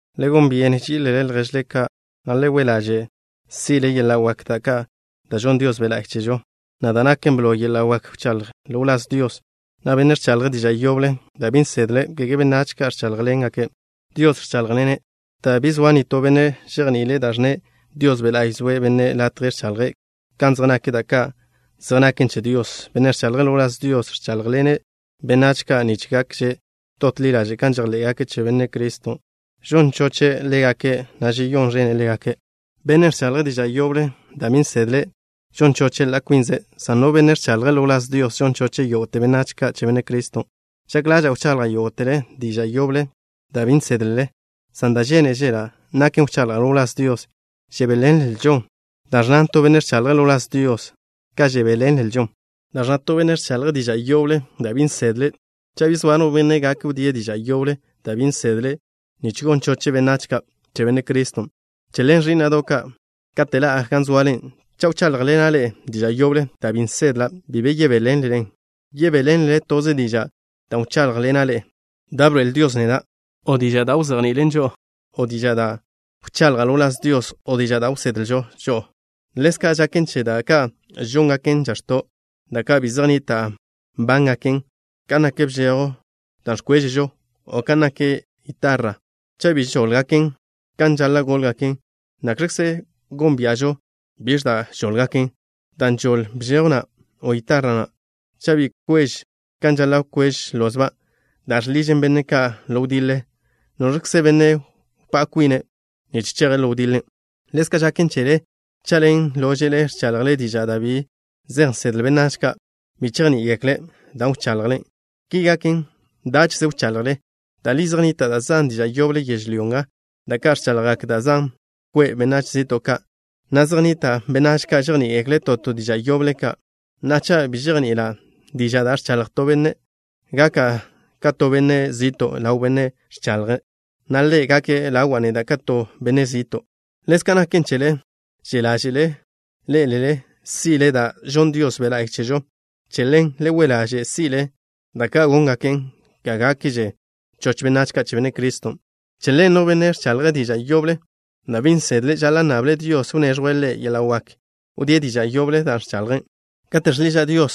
Le gon byene ží'ilele lježle ka', na' le we' ḻaže' si'le yeḻa' wak ka' da' žonn Dios Be' La'y chežo, na' da' naken blo, yeḻa' wak wchaḻjle ḻo wláz Dios. No benne' ẕchaḻje' diža' yoble da' bi nsedle', kege benách ka' ẕcháḻjḻene'. Dios ẕcháḻjḻenze', dan' bi zoa nitó benne' žejni'ile' da' ẕnne'. Dios Be' La'y žoe'e bennen' latje ẕchaḻje' kan zej nak da' ka' zej ngache' che Dios. Bennen' ẕchaḻje' ḻo wláz Dios, ẕcháḻjḻene' benách ka' nich gakže dot ḻi ḻaže' kan žejḻé'gake' che Benne' Criston'. Žon choche' ḻégake', na' žeyón ẕene' ḻégake'. Bennen' ẕchaḻje' diža' yoble da' bi nsedle' žon choche' ḻa' kwinze', san no benne' ẕchaḻje' ḻo wláz Dios žon choche' yógo'te benách ka' che Benne' Criston'. Žak ḻaža'a wchaḻjle yógo'tele diža' yoble da' bi nsédlele, san da' žénežela' naken wchaḻjle ḻo wláz Dios. Žebéḻenželžo da' ẕnna to benne' ẕchaḻje' ḻo wláz Dios ka žebéḻenlžo da' ẕnna to benne' ẕchaḻje' diža' yoble da' bi nsedle', cha' bi zoa no benne' gak wdíe' diža' yoblen' da' bi nsedle', nich gon choche' benách ka' che Benne' Criston'. Che ḻen, ẕí'na'do' ka', kate' ḻa'a gan zoale, cha' wcháḻjḻena' ḻe'e diža' yoble da' bi nsedla', bi be yebéḻenlelen. Yebéḻenlele toze dižan' da' wcháḻjḻena' ḻe'e da' bḻoe'el Dios neda', o diža' da' wzejni'ilen žo'o, o diža' da' wchaḻja' ḻo wláz Dios, o diža' da' wsedlen žo'o. Ḻezka' žaken che da' ka' žóngaken žax̱to', da' ka' bi zej nnita' nbángaken, kan nak bžejw da' ẕkwežžon, o kan nak gitarra. Cha' bi žóḻgaken kan žaḻa' góḻgaken, ¿nakx̱kze gónbia'žo biẕ da' žóḻgaken, dan' žoḻ bžejw na', o gitarra na'? Cha' bi kwež kan žaḻa' kwež lozban' da' žḻižen benne' ka' ḻo wdiḻe, ¿noẕkze benne' wpá' kwine' nich cheje' ḻo wdiḻen'? Ḻezka' žaken chele. Cha' ḻen lóže'le ẕchaḻjle diža' da' bi zej nsedle benách ka', bi chejní'igekle' da' wchaḻjle. Ki gaken, dáche'ze wchaḻjle. Da' li zej nnita' da' zan diža' yoble yežlyó nga da' ka' ẕchaḻjgak da' zan kwe' benách zi'to' ka', na' zej nnita' benách ka' žejní'igekle' to to diža' yoble ka'. Na'a, cha' bi žejni'ila' diža' da' ẕchaḻj to benne', gaka' ka to benne' zi'to' ḻaw bennen' ẕchaḻje', na' ḻe' gake' ḻawa' neda' ka to benne' zi'to'. Ḻezka' naken chele. Že' ḻáže'ḻe'ele si'le da' žonn Dios Be' La'y chežo. Che ḻen, le we' ḻaže' si'le da' ka' góngaken ga gákgakže choch benách ka' che Benne' Criston'. Che ḻen, no benne' ẕchaḻje' diža' yoble da' bi nsedle' žaḻa' nnable' Dios wneẕjwe' ḻe' yeḻa' wak wdíe' diža' yoble dan' ẕchaḻje'. Kate' žḻiža' Dios,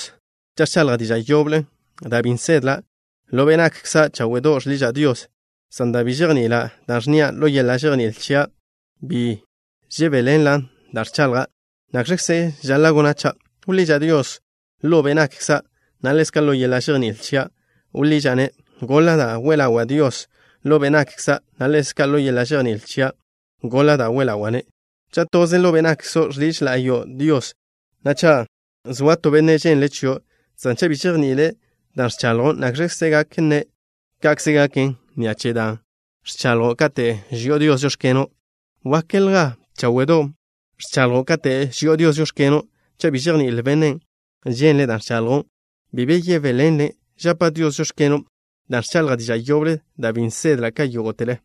cha' ẕchaḻja' diža' yoble da' bi nsedla', ḻo be' nakkza' cháwe'do' žḻiža' Dios, san dan' bi žejni'ila' da' ẕnnia', ḻo yeḻa' žejní'il chia' bi žebéḻenla' dan' ẕchaḻja'. ¿Nakx̱kze žaḻa' gona' cha'? Wḻiža' Dios ḻo be' nakkza', na' ḻezka' ḻo yeḻa' žejní'il chia' wḻiža'-ne'. Goḻa' da' we ḻawa' Dios ḻo be' nakkza', na' ḻezka' ḻo yeḻa' žejní'il chia' goḻa' da' we ḻawa'-ne'. Cha' toze ḻo be' nakkzo' žḻiž la'yo' Dios, na' cha' zoa to benne' žénzele' chio', san cha' bi žejni'ile' dan' ẕchaḻjo', ¿nakx̱kze gak nne': “Ka'kze gaken” ni'a che dan' ẕchaḻjo', kate' ži'o Dios: “Žóx̱keno'?” Wákelja cháwe'do' ẕchaḻjo', kate' ži'o Dios: “Žóx̱keno'.” Cha' bi žejní'il bennen' ženle' da' ẕchaḻjo', bi be yebéḻenlen'. Žapa' Dios: “Žóx̱keno'” dan' ẕchaḻjža' diža' yoble da' bi nsedla' ka yógo'tele.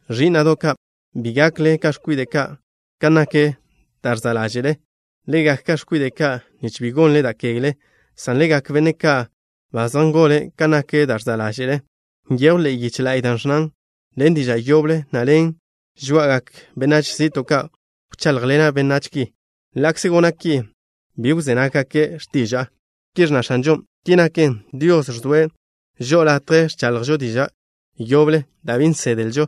Ẕí'na'do' ka', bi gakle ka x̱kwide' ka' kan nak da' ẕza' ḻáže'le. Le gak ka x̱kwide' ka' nich bi gonle da' kegle, san le gak benne' ka' ba zej ngole' kan nak da' ẕza' ḻáže'le. Nyejw ḻe'e yiche la'y da' ẕnnan: “Ḻen diža' yoble, na' ḻen žoá'agak benách zi'to' ka' wcháḻjḻena' benách ki. Ḻa'kze gona' ki, bi wzé nággake' x̱tiža'a.” Ki ẕnna X̱anžon'. Ki naken, Dios žoe'e žo'o latje ẕchaḻjžo diža' yoble da' bi nsedlžo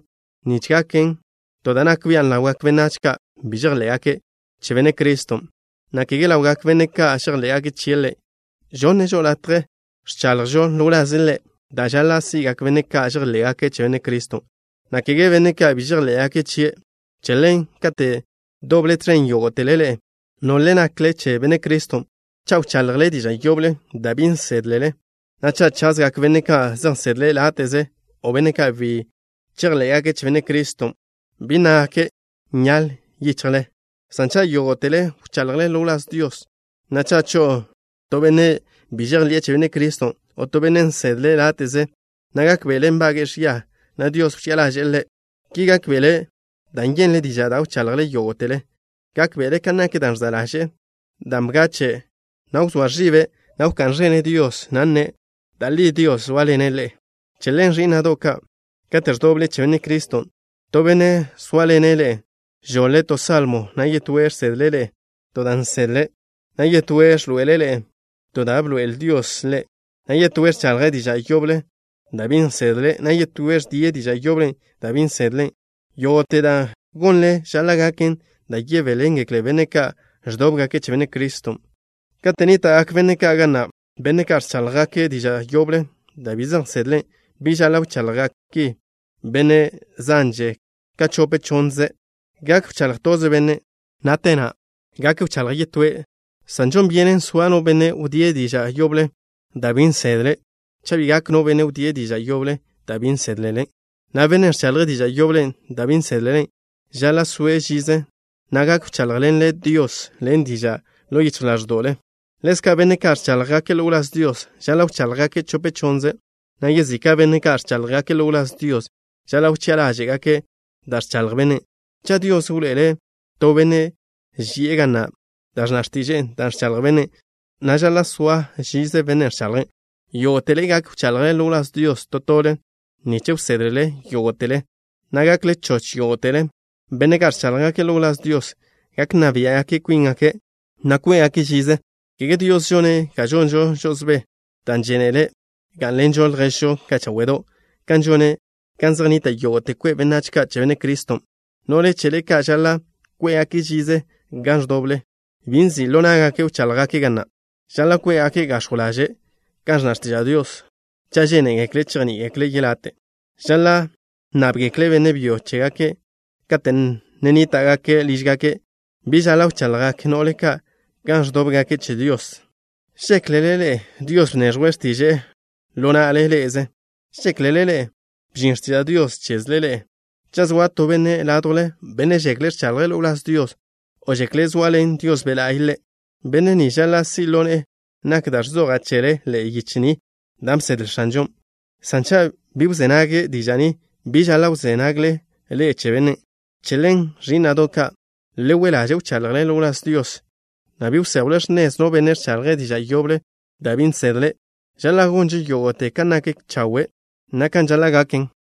nich gaken to da' nak bian' ḻawgak benách ka' bi žejḻé'gake' che Benne' Criston', na' kege ḻawgak benne' ka' žejḻé'gake' chie' Ḻe'. Žoe'e žo'o latje ẕchaḻjžo ḻo wlaze' Ḻe' da' žaḻa' si'gak benne' ka' žejḻé'gake' che Benne' Criston', na' kege benne' ka' bi žejḻé'gake' chie'. Che ḻen, kate' doble tẕen, yógo'tele ḻe'e, nole nakle che Benne' Criston', cha' wchaḻjle diža' yoble da' bi nsédlele, na' cha' chazgak benne' ka' zej nsedle' láte'ze, o benne' ka' bi na' chejḻé'gake' che Benne' Criston', ¿bi nnágake': “Nyaḻ yichjle”? San cha' yógo'tele wchaḻjle ḻo wláz Dios, na' cha' cho'o to benne' bi žejḻi'e che Benne' Criston', o to benne' nsedle' láte'ze, na' gákbe'ele' nbage'e ẕia, na' Dios wchi'a ḻaže'e ḻe'. Ki gákbe'ele' dan' yenle' diža' da' wchaḻjle yógo'tele. Gákbe'ele' kan nak da' ẕza' ḻaže'e, dan' bgachen', na' wzóa ẕibe', na' wká'n ẕene' Dios, na' nne': “Da' li Dios zóaḻene' ḻe'e.” Che ḻen, ẕí'na'do' ka', kate' ẕdoble che Benne' Criston', to benne' zóaḻene' ḻe'e žoḻe' to salmo, na' yetóe' žsedle' ḻe'e to da' nsedle', na' yetóe' ẕḻoe'ele' ḻe'e to da' bḻoe'el Dios ḻe', na' yetóe' ẕchaḻje' diža' yoble da' bi nsedle', na' yetóe' ẕdie' diža' yoblen' da' bi nsedle'. Yógo'te da' gonle žaḻa' gaken da' yebéḻengekle benne' ka' ẕdóbgake' che Benne' Criston'. Kate' nníta'gak benne' ka' ga na', benne' ka' ẕcháḻjgake' diža' yoble da' bi zej nsedle', bi žaḻa' wchaḻjgak ki benne' zanže ka chope chónnzele. Gak wcháḻj toze bennen', na' te na' gak wchaḻje' yetóe', san žon byenen soa no benne' wdíe' diža' yoblen' da' bi nsédlele. Cha' bi gak no benne' wdíe' diža' yoblen' da' bi nsédlele, na' bennen' ẕchaḻje' diža' yoblen' da' bi nsédlele, žaḻa' soe' žize gan ndoble, na' gak wcháḻjḻene' Dios ḻen dižan' ḻo yichj ḻáẕda'we'. Ḻezka', benne' ka' ẕcháḻjgake' ḻo wláz Dios žaḻa' wcháḻjgake' chope chonnze', na' yezika' benne' ka' ẕcháḻjgake' ḻo wláz Dios žaḻa' wchi'a ḻáže'gake' da' ẕchaḻj bennen'. Cha' Dios wḻoe'ele' to benne' ži'e ga na' da' ẕnna x̱tiže'e dan' ẕchaḻj bennen', na' žaḻa' soa žize bennen' ẕchaḻje'. Yógo'tele gak wchaḻjle ḻo wláz Dios to tole nich wsédlele yógo'tele, na' gakle choch yógo'tele. Benne' ka' ẕcháḻjgake' ḻo wláz Dios gak nna biá'gake' kwíngake', na' kwé'gake' žize. Kege Dios žone' ga žonžo žo'osbé, dan' žénele' Ḻe' gá'nḻenžo lježžo ka' cháwe'do', kan žone' gan zej nnita' yógo'te kwe' benách ka' che Benne' Criston'. No'le chele ka' žaḻa' kwé'gake' žize gan ẕdoble. Bi nzi' ḻo ná'gake' wcháḻjgake' ga na'. Žaḻa' kwé'gake' gax̱jw ḻaže' kan ẕnna x̱tiža' Dios. Cha' žénegekle' chejní'igekle' yelate', žaḻa' nnábgekle' benne' byo che chégake' kate' ne nníta'gake' lížgake'. Bi žaḻa' wchaḻjgak no'le ka' gan ẕdóbgake' che Dios. ¿Žéklele ḻe'e Dios bneẕjwe' x̱tiže'e ḻo na'le ḻe'eze? ¿Žéklele ḻe'e bžin x̱tiža' Dios chezle ḻe'e? Cha' zoa to benne' ládjwle, benne' žekle' ẕchaḻje' ḻo wláz Dios, o žekle' zoaḻen Dios Be' La'y ḻe', benne' ni žaḻa' si' ḻo ne'e nak da' ẕzoja' chele ḻe'e yiche ni da' bsedle X̱anžon'. San cha' bi wzé nage' diža' ni, bi žaḻa' wzé nagle ḻe'e che bennen'. Che ḻen, ẕí'na'do' ka', le we' ḻaže' wchaḻjle ḻo wláz Dios, na' bi wséjwle x̱nez no benne' ẕchaḻje' diža' yoble da' bi nsedle'. Žaḻa' gonžo yógo'te kan nak chawe', na' kan žaḻa' gaken.